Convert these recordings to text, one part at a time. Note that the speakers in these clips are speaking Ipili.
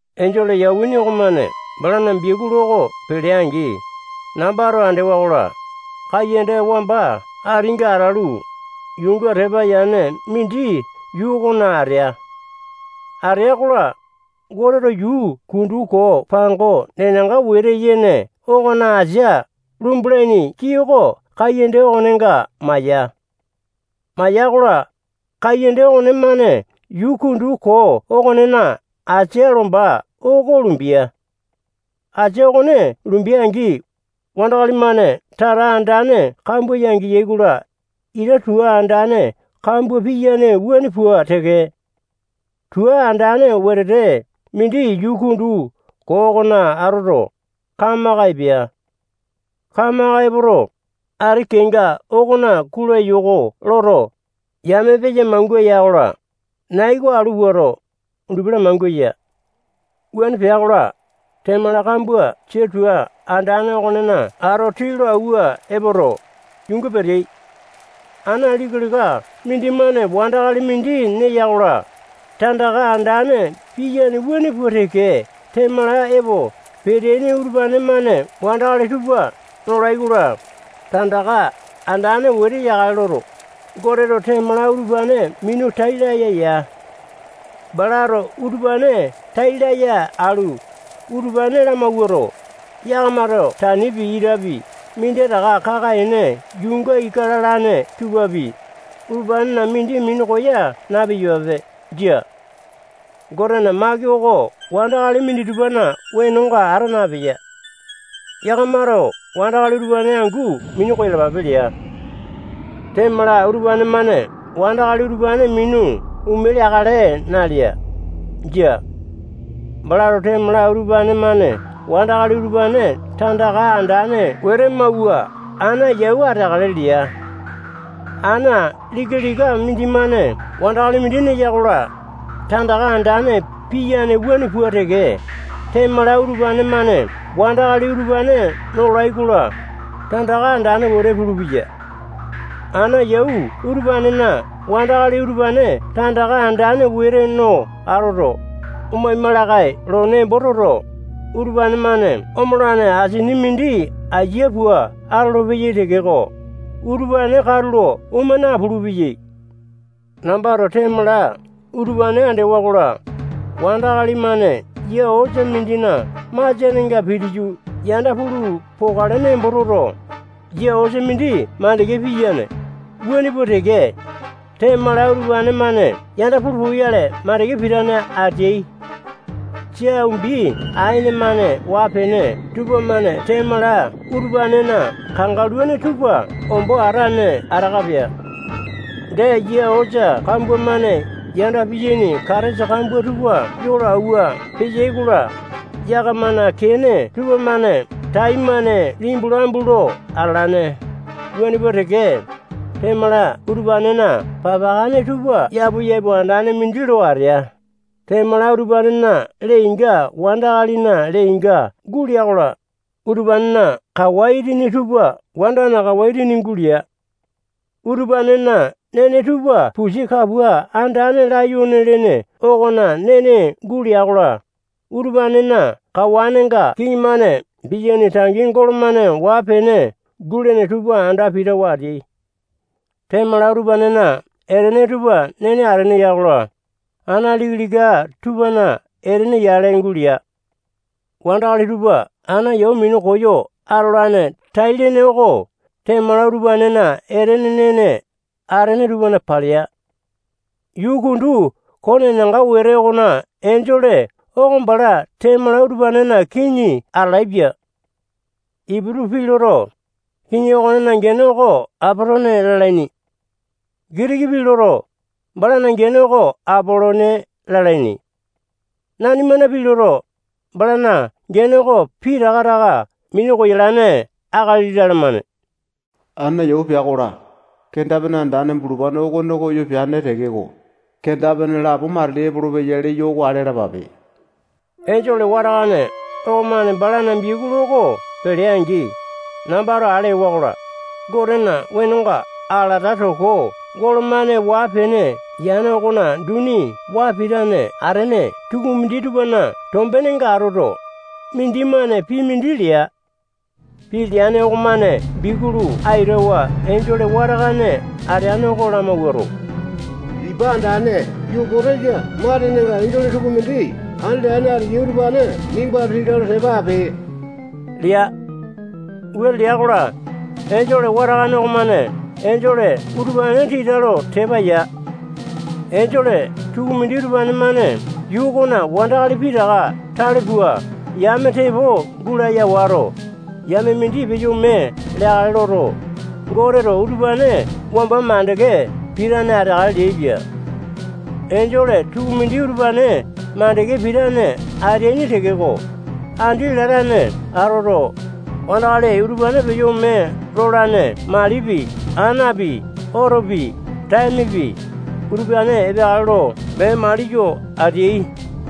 Enjole yawini okomane balana biakulu oko pelea-angi, nambato andewa-kola, kaiyanda wamba atinga atalu, yuunga tepa yane mindi yuu okona atea. Atea-kola, Goteto yuu kundu koo pango nenanga wete yene okona asia lumbalaini kii oko kaiyanda okonenga maya. Maya-kola, kaiyanda okonemane yuu kundu koo okonena asia lomba oko lumbea. Asia okone lumbea-angi, wandakali-mane tata andane kambua yangeyai-kola, ita tua andane kambua piyane wuane pua teke, tua andane wetete mindi yuu kundu koo okona atoto, kamaka epea. Kamaka epoto, ati kenga okona kulayoko loto, yame peya mangua ya-kola, nai oko alu puato, undupi lamangua ya. Wuane pea-kola, temala kambua sia tua andane okonena ato tii lo awua epoto, yuunga peteai. Ana lika-lika mindimane wandakali mindi neya-kola, tandaka andane piyane wuane pua teke temala epo peteaini utupane-mane wandakali tupa nolai-kola, tandaka andane wete yakale loto, Goteto temala utupane minu tai laya ya. Balato utupane tai laya alu, utupane lamawuato, yakamato tanipi, itapi, minditaka kaka-ene yuunga ika lalane tupapi, utupanena mindi minu koya na-piyapape. Jia. Gotena maki oko wandakali minditupana wenonga ata napeya. Yakamato wandakali utupane angu minu koyalapape lea. Temala utupane-mane wandakali utupane minu ome leakale nalea. Jia. Balato temala utupane-mane wandakali utupane tandaka andane wete mauwa ana yau ateakale lea. Ana lika-lika mindimane wandakali mindi neya-kola, tandaka andane piyane wuane pua teke, temala utupane-mane wandakali utupane nola-kola, tandaka andane wete pulupeya. Ana yau utupanena wandakali utupane tandaka andane wete no atoto, omaima lakae lo nembo toto, utupane-mane omolane asini mindi aiya pua atolopeyai tekeko, utupane katulo oma napulu-peyai. Nambato temala utupane andewa-kola, wandakali-mane yia osa mindina masianenga pitiyu yanda pulu pokale nembo toto, yia osa mindi makande piyane, wuane pua teke, temala utupane-mane yanda pulu poyale makande pitane ateai. Sia umbi aene-mane waa-pene tupamane temala utupanena kangaluane tupa ombo atane ataka pea. Dee, yia osa kambua-mane yanda piyaini katesa kambua tupa yo lo auwa peyai-kola, yakamana kene tupamane taimane limbu lambu lo atalane, wuane pua teke, temala utupanena papakane tupa yapu-yapu andane mindi lo atea. Temala utupanena lee-inga wandakalina lee-inga gulea-kola, utupanena kawa itini tupa wandana kawa itini gulea. Utupanena nene tupa pusi kapua andane layone lene okona nene gulea-kola, utupanena kawanenga kiŋi-mane piyaini tangi golo-mane waa-pene gulene tupa anda pitawa ateai. Temala utupanena etene tupa nene atene ya-kola, ana lika-lika tupana etene yale gulea. Wandakali tupa ana yau minu koyo atolane tai-lene oko temala utupanena etene nene atene tupana palea. Yuu kundu koo nenanga wete okona enjole oko bala temala utupanena kiŋi atalaepia. Iputu pii loto, kiŋi okonena gene oko Apatone lalaini. Gitiki pii loto, balana gene oko Apalone lalaini. Nanimana pii loto, balana gene oko pitaka taka minu koyalane akali lalamane. Ana yau pea-kola, kenda-pene andane bulupane okone koyo peane tekeko, kenda-pene lapo matili epolopeya leyo oko ale alapape. Enjole watakane okomane balana biakulu oko pelea-angi, nambato ale ewa-kola, Gotena wenonga alata toko golo-mane waa-pene yane okona duni waa pitane atene tukumindi tupana tombenenga atoto, mindimane pii mindi lea. Pii leane okomane biakulu aitawa enjole watakane ateane oko lamawuato, ipa andane Yupotesa matenenga enjole tukumindi andi latane ateyai utupane nimbato tita lo tepa ape lea. Wuane lea-kola, enjole watakane okomane enjole utupane tita lo tepa ya. Enjole tukumindi utupane-mane yuu okona wandakali pitaka tale pua yame tepo gulaya wato, yame mindi peyo ome leakale loto, Goteto utupane wamba makande pitane ateakale leaipia. Enjole tukumindi utupane makande pitane ateaini tekeko, andi latane atoto, wandakali utupane peyo ome lolane malipi, anapi, otopi, taemepi, utupane epeakale lo mee maliyo ateai.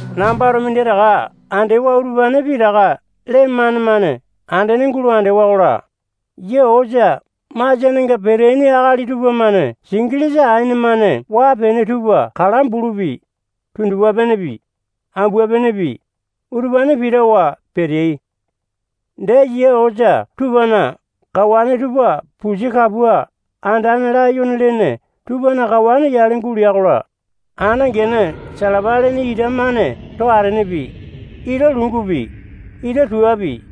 Nambato minditaka andewa utupane pitaka lee mane-mane andene andewa-kola, yia osa masianenga peteaini akali tupamane singilisa aene-mane waa-pene tupa kala bulupi, tundupa-penepi, ambua-penepi, utupane pitawa peteai. Dee, yia osa tupana kawane tupa pusi kapua andane layone lene tupana kawane yale gulea-kola, ana gene salapa lene ita-mane too atenepi, ita lungupi, ita tuapi,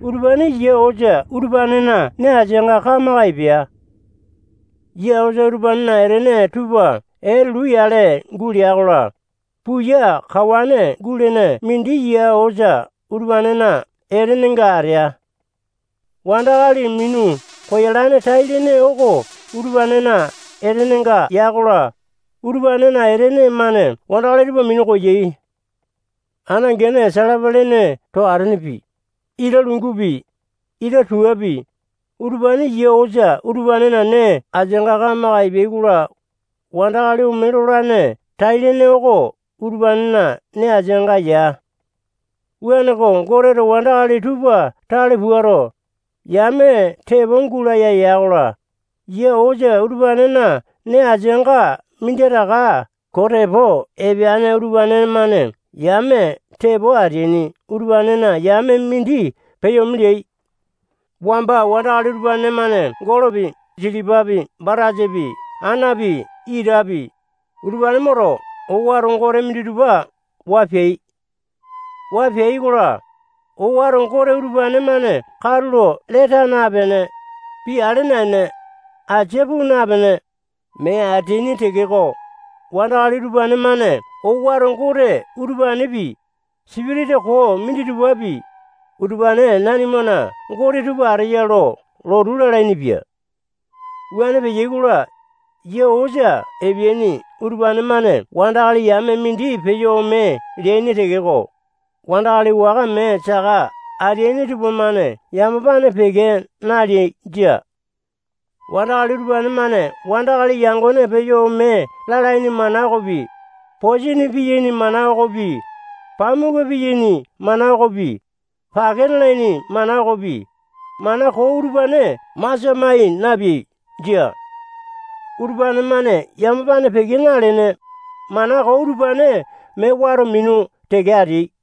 utupane yia osa utupanena nee asianga kamaka epea. Yia osa utupanena etene tupa etulu yale gulea-kola, puya kawane gulene mindi yia osa utupanena etenenga atea. Wandakali minu koyolane tai-lene oko utupanena etenenga ya-kola, utupanena etene-mane wandakali tupa minu koyai. Ana gene salapa lene too atenepi, ita lungupi, ita tuapi, utupane yia osa utupanena nee asianga kamaka epea-kola, wandakali ome lolane tai-lene oko utupanena nee asianga ya. Wuaneko, Goteto wandakali tupa tale puato, yame tepo gulaya ya-kola, yia osa utupanena nee asianga minditaka koo tepo epeane utupane-mane yame tepo ateaini utupanena yame mindi peyo ome leai. Wamba wandakali utupane-mane golopi, silipapi, batasapi, anapi, itapi, utupane moto, owato gote minditupa waa peai. Waa peai-kola, owato gote utupane-mane katulo lee taa napene, pii ale naene, asia puu napene, mee ateaini tekeko, wandakali utupane-mane owato gote utupanepi, sipitisa koo minditupapi, utupane nanimana gote tupa ateyai lo lotu lalainipia. Wuane peai-kola, yia osa epeaini utupane-mane wandakali yame mindi peyo ome leaini tekeko, wandakali waka mee saka ateaini tupamane yamapane peke naleai. Jia. Wandakali utupane-mane wandakali yangone peyo ome lalaini mana okopi, posini piyaini mana okopi, pamuku piyaini mana okopi, pake mialaini mana okopi, mana koo utupane masia mai napeai. Jia. Utupane-mane yamapane peke nalene, mana koo utupane mee wato minu teke ateai.